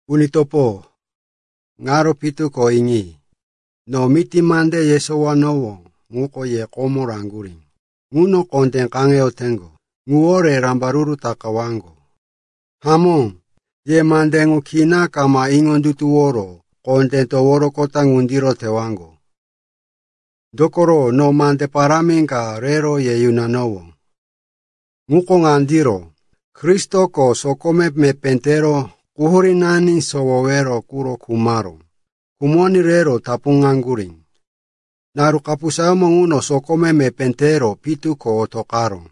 Uni topo, ŋaro pitu ko iŋi. No miti mande yesowanowó ŋuko ye komo raŋgurí, ŋuno kondé kaŋeyoteŋgo, ŋuwore rambaruru takawaŋgo. Hamó, ye mande ŋu kina kama iŋondutuworo kondé toworoqota ŋundiro tewaŋgo. Dokoro no mande parámi ka rero ye yunanowó. Ŋuko ŋandiro: Kristoko sokome mepé tero quhurínani sowowero quro khumaró. Khumoní rero tapuŋaŋgurí. Naru kapusayómo ŋuno sokome mepé tero pitu ko otoqaró.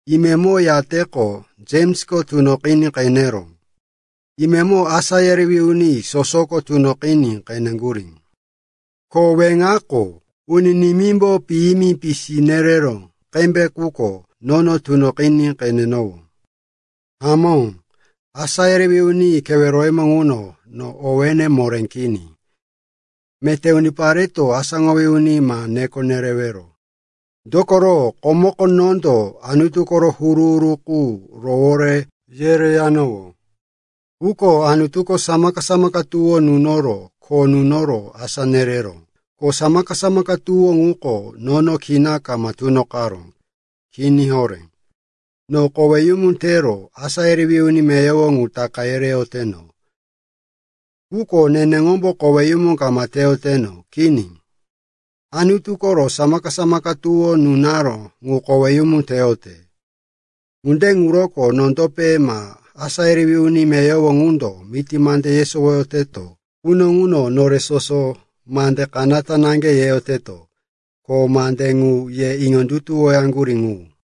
Imemo yateqo Jemsko tunoqiní qeneró. Imemo asá yerewí uni sosoko tunoqiní qeneŋgurí. Ko, weŋako, uni nimímbo piyimi pisi nereró qembe quko nono tunoqiní qenenowó. Hamó, asá yerewí uni keweroyemo ŋuno no owéne moré kini. Meté unipareto “asáŋowí uni” ma neko nerewero. Dokoro komoko nondo Anutu koro huru-huru qu rowore yereyanowó. Quko Anutuko samaka-samaka tuwó nunoro kho nunoro asá nereró. Ko samaka-samaka tuwó ŋuko nono kina kama tunoqaró. Kini horé. No koweyumu tero asá yerewí uni meyowo ŋu taka yereyoteno. Quko neneŋombo koweyumu kama teyoteno, kini. Anutu koro samaka-samaka tuwó nunaró ŋu koweyumu teyote. Ŋunde ŋuroko nondope ma asá yerewí uni meyowo ŋundo miti mande yesowoyoteto quno ŋuno nore soso mande kanata naŋge yeyoteto. Ko mande ŋu ye iŋondutuwoyaŋgurí ŋu.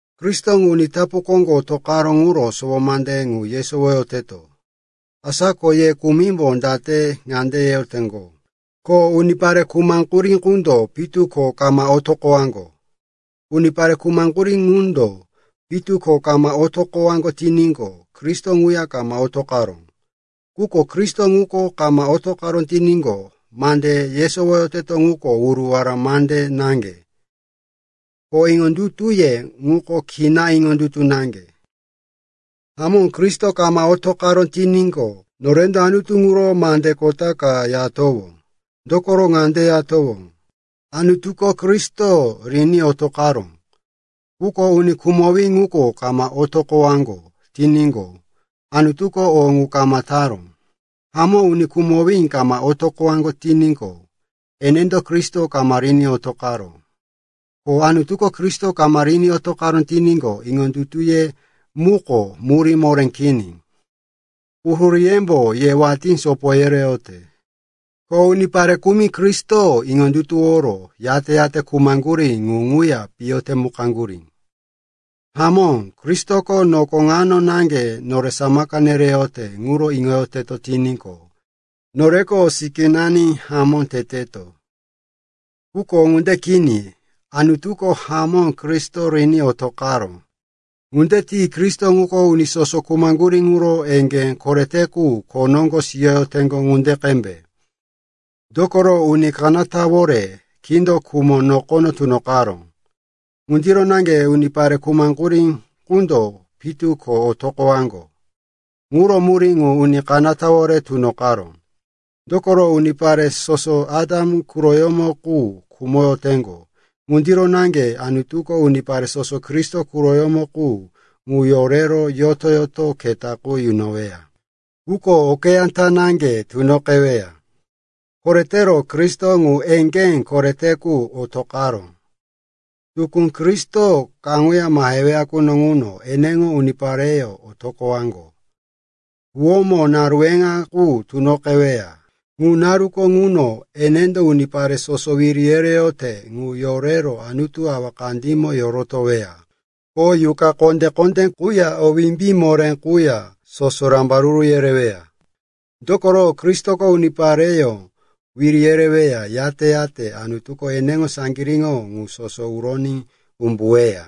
Kristo uni tapu koŋgo otoqaró ŋuro sowo mande ŋu yesowoyoteto. Asa ko ye kumimbo date ŋande yeyoteŋgo, ko unipare khumaŋgurí qundo pitu ko kama otoqowaŋgo? Unipare khumaŋgurí ŋundo pitu ko kama otoqowaŋgo tiníqo, Kristo ŋuya kama otoqaró. Quko Kristo ŋuko kama otoqaró tiníqo, mande yesowoyoteto ŋuko wuruwara mande naŋge, ko iŋondutuye ŋuko kina iŋondutu naŋge. Hamó, Kristo kama otoqaró tiníqo, norendo Anutu ŋuro mande kota ka yatowó. Dokoro ŋande yatowó, “Anutuko Kristo riní otoqaró.” Quko uni khumowí ŋuko kama otoqowaŋgo tiníqo, Anutuko o ŋu kama taró. Hamó, uni khumowí kama otoqowaŋgo tiníqo, enendo Kristo kama riní otoqaró. Ko Anutuko Kristo kama riní otoqaró tiníqo, iŋondutuye muko murí moré kini. Quhuríyembo ye watí sopo yereyote. Ko unipare kumi Kristo iŋondutuworo, yate-yate khumaŋgurí ŋu ŋuya piyo temukaŋgurí. Hamó, Kristoko noko ŋano naŋge nore samaka nereyote ŋuro iŋoyoteto tiníqo, noreko sikínani hamó teteto. Quko ŋunde kini. Anutuko hamó Kristo riní otoqaró. Ŋunde tiní Kristo ŋuko uni soso khumaŋgurí ŋuro eŋgé korete qu kho noŋgo siyoteŋgo ŋunde qembe. Dokoro uni kanatawore kindo khumo nokono tunoqaró. Ŋundiro naŋge unipare khumaŋgurí qundo pitu ko otoqowaŋgo ŋuro murí ŋu uni kanatawore tunoqaró. Dokoro unipare soso Atam quroyómo qu khumoyoteŋgo. Ŋundiro naŋge Anutuko unipare soso Kristo quroyómo qu ŋu yorero yoto-yoto keta qu yunoweya. Quko okeyá ta naŋge tunoqeweya. Koretero Kristo, ŋu eŋgé korete quko otoqaró. Tukú Kristoko kaŋuya maheweya quno ŋuno eneŋo unipareyó otoqowaŋgo. Huwómo naru weŋa qu tunoqeweya. Ŋu naruko ŋuno enendo unipare soso wiri yereyote ŋu yorero Anutu Awa kandímo yorotoweya, ko yuqa kondé-kondé quya o wimbí moré quya soso rambaruru yereweya. Dokoro, Kristoko unipareyó wiri yereweya, yate-yate Anutuko eneŋo saŋgiríŋo ŋu soso uroní umbuweya.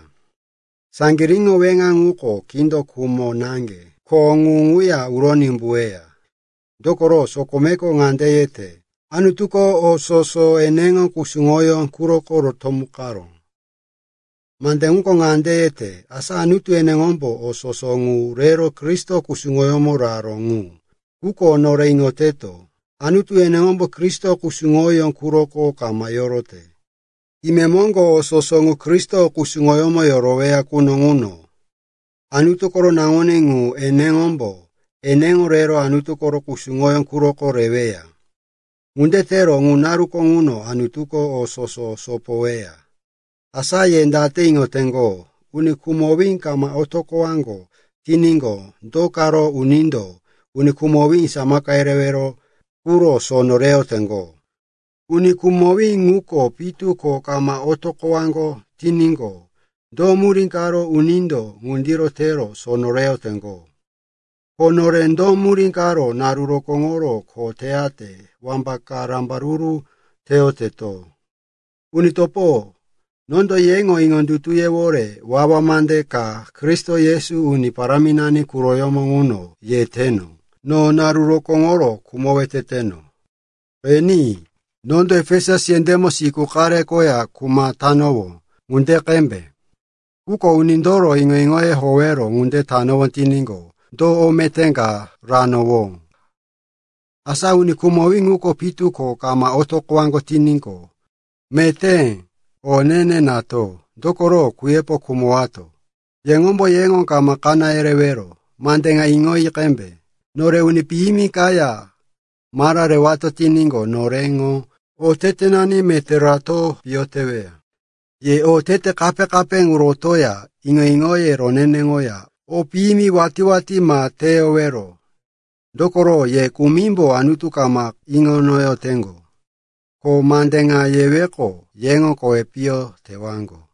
Saŋgiríŋo weŋa ŋuko kindo khumo naŋge, ko ŋu ŋuya uroní umbuweya. Dokoro sokomeko ŋande yete, “Anutuko o soso eneŋo kusuŋoyó quroko rotomukaró.” Mande ŋuko ŋande yete, asa Anutu eneŋombo o soso ŋu rero Kristo kusuŋoyómo raró ŋu. Quko nore iŋoteto, Anutu eneŋombo Kristo kusuŋoyó quroko kama yorote. Imemoŋgo o soso ŋu Kristo kusuŋoyómo yoroweya quno ŋuno, Anutu koro Naŋuní ŋu eneŋombo eneŋo rero Anutu koro kusuŋoyó quroko reweya. Ŋunde tero ŋu naruko ŋuno Anutuko o soso sopoyoweya. Asa ye date iŋoteŋgo, uni khumowí kama otoqowaŋgo tiníqo, do karo unindo uni khumowí samaka yerewero quro sono reyoteŋgo? Uni khumowí ŋuko pitu ko kama otoqowaŋgo tiníqo, do murí karo unindo ŋundiro tero sono reyoteŋgo? Ko nore do murí karo naru rokóŋoro kho teyate wambaka rambaruru teyoteto? Uni topo, nondo yeŋo iŋondutuyewore wawa mande ka Kristo Yesu Uni Paráminani quroyómo ŋuno yeteno, no naru rokóŋoro khumowe teteno. Qeni, nondo Efesus yendémo siku qare koya kuma tanowó ŋunde qembe. Quko unindoro iŋo-iŋoye howero ŋunde tanowó tiníqo, do o meté ka ranowó? Asa uni khumowí ŋuko pitu ko kama otoqowaŋgo tiníqo, “Meté o ne-ne nato, dokoro kuyepo khumowato.” Yeŋombo yeŋo ma kaná yerewero. Mande ŋa iŋoyi qembe, “Nore uni piyimi kaya mara rewato tiníqo, noreŋo otetenani meté rato piyo teweya.” Ye otete kape-kape qu rotoya iŋo-iŋoye roneneŋoya o piyimi watí-watí ma teyowero. Dokoro ye kumimbo Anutu kama iŋo inoyoteŋgo. Ko mande ŋa yeweqo, yeŋo kowi piyo tewaŋgo.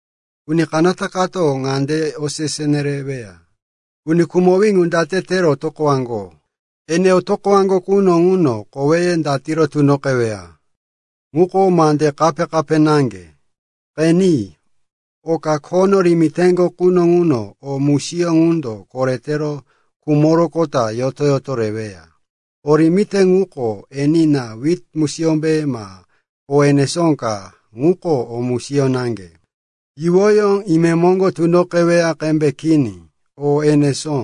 Uni kanata kato ŋande osese neweya, peka, “Uni khumowí ŋu date tero otoqowaŋgo? Ene otoqowaŋgo quno ŋuno koweye datiro tunoqeweya?” Ŋuko mande kape-kape naŋge. Qeni, oka khono rimiteŋgo quno ŋuno o musiyó ŋundo koretero khumoroqota yoto-yoto reweya. O rimite ŋuko, enina, wit musiyómbe ma o enesó ka, ŋuko o musiyó naŋge, yuwoyó imemoŋgo tunoqeweya qembe kini, o enesó.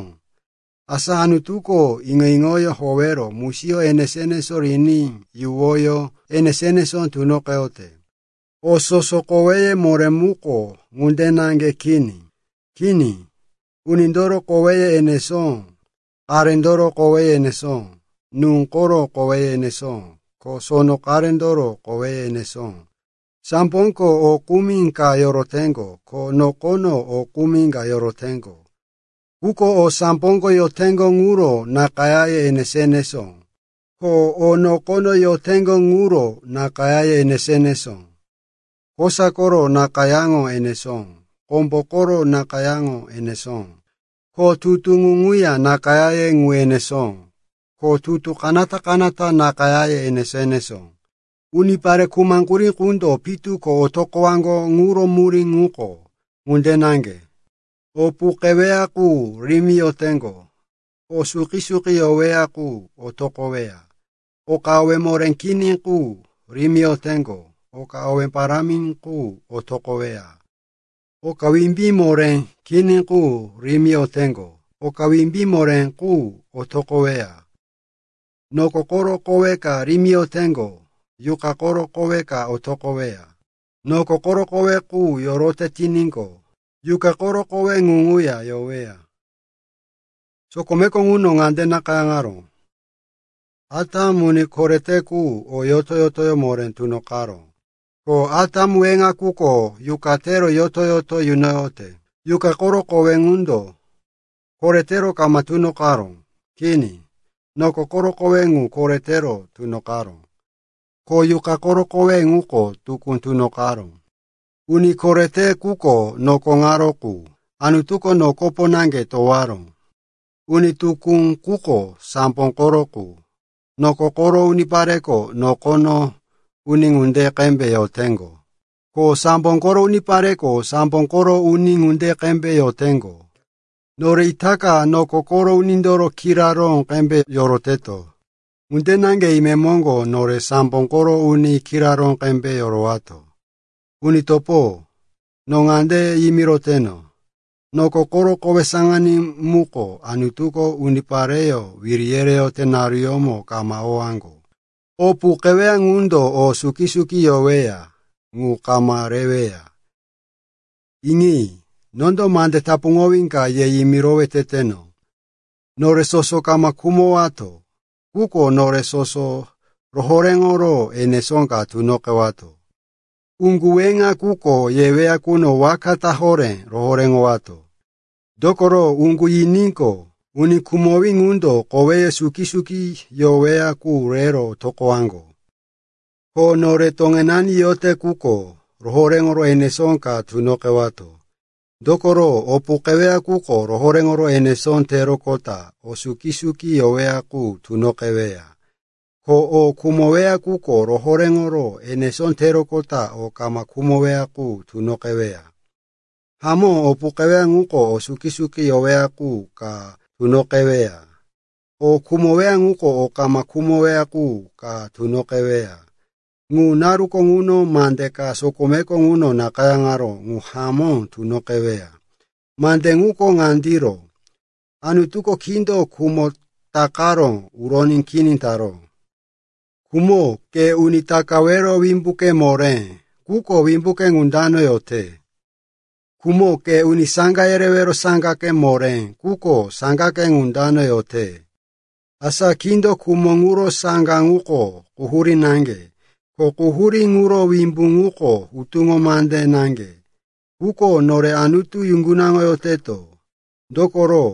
Asa Anutuko iŋo-iŋoyó howero musiyó enesó-enesó riní yuwoyó enesó-enesó tunoqeyote. O soso koweye moré muko ŋunde naŋge kini. Kini, unindoro koweye enesó, qarendoro koweye enesó, nú koro koweye enesó, ko sono qarendoro koweye enesó. Samboko o kumi ka yoroteŋgo, ko nokono o kumi ka yoroteŋgo. Quko o samboko yoteŋgo ŋuro nakayáye enesó-enesó, ko o nokono yoteŋgo ŋuro nakayáye enesó-enesó. Kosa koro nakayáŋo enesó, kombo koro nakayáŋo enesó, ko tutu ŋu ŋuya nakayáye ŋu enesó. Ko tutu kanata-kanata nakayáye enesó-enesó. Unipare khumaŋgurí qundo pitu ko otoqowaŋgo ŋuro murí ŋuko ŋunde naŋge. O puqeweya qu rimiyoteŋgo, o suki-suki yoweya qu otoqoweya. Oka owé moré kini qu rimiyoteŋgo, oka owé parámi qu otoqoweya. Oka wimbí moré kini qu rimiyoteŋgo, oka wimbí moré qu otoqoweya. Noko koro kowe ka rimiyoteŋgo, yuqa koro kowe ka otoqoweya. Noko koro kowe qu yorote tiníqo, yuqa koro kowe qu ŋuya yoweya. Sokomeko ŋuno ŋande nakayáŋaró, “Atam, uni korete quko o yoto-yotoyó moré tunoqaró.” Ko Atam weŋa quko yuqa tero yoto-yoto yunoyote. Yuqa koro kowe ŋundo koretero kama tunoqaró. Kini. Noko koro kowe ŋu koretero tunoqaró. Ko yuqa koro kowe ŋuko tukú tunoqaró. Uni korete quko noko ŋaro qu. Anutuko nokopo naŋge towaró. Uni tukú quko sambo koro qu. Noko koro unipareko noko uni ŋunde qembe yoteŋgo. Ko sambo koro unipareko sambo koro uni ŋunde qembe yoteŋgo. Nore itaka noko koro unindoro kiraró qembe yoroteto. Ŋunde naŋge imemoŋgo nore sambo koro uni kiraró qembe yorowato. Uni topo, no ŋande yimiroteno, noko koro kowe saŋaní muko Anutuko unipareyó wiri yereyote naruyómo kama owaŋgo. O puqeweya ŋundo o suki-suki yoweya ŋu kama reweya. Iŋi. No mande tapuŋowí ka ye yimirowe teteno. Nore soso kama khumowato. Quko nore soso rohoréŋoro enesó ka tunoqewato. Uŋgu weŋa quko yeweya quno waka ta horé rohoréŋowato. Dokoro uŋgu yiníqo, uni khumowí ŋundo koweye suki-suki yoweya qu rero otoqowaŋgo. Ko nore toŋenani yote quko rohoréŋoro enesó ka tunoqewato. Dokoro o puqeweya quko rohoréŋoro enesó teroqota o suki-suki yoweya qu tunoqeweya. Ko o khumoweya quko rohoréŋoro enesó teroqota o kama khumoweya qu tunoqeweya. Hamó, o puqeweya quko o suki-suki yoweya qu ka tunoqeweya, o khumoweya quko o kama khumoweya qu ka tunoqeweya. Ŋu naruko ŋuno mande ka sokomeko ŋuno nakayáŋaró qu hamó tunoqeweya. Mande ŋuko ŋandiro: “Anutuko kindo khumo takaro uroní kini taró.” “Khumo, ke uni takawero wimbuke moré, quko wimbuke ŋu dano yote? Khumo, ke uni saŋga yerewero saŋgake moré, quko saŋgake ŋu dano yote?” Asa kindo khumo ŋuro saŋga ŋuko quhurí naŋge, ko quhurí ŋuro wimbu ŋuko hutuŋo mande naŋge. Quko nore Anutu yuŋgunaŋoyoteto, dokoro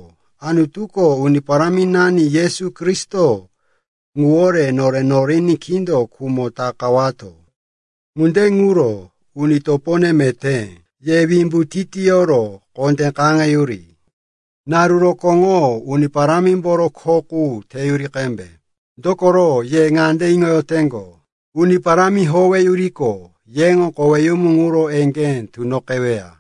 Anutuko Uni Paráminani Yesu Kristo ŋuwore nore noriní kindo khumo takawato. Ŋunde ŋuro, uni topone meté, ye wimbu titiyoro kondé kaŋeyuri. Naru rokóŋo Uni Parámimboro kho qu teyuri qembe, dokoro ye ŋande iŋoyoteŋgo, Uni Parámi howeyuriqo, yeŋo koweyumu ŋuro eŋgé tunoqeweya.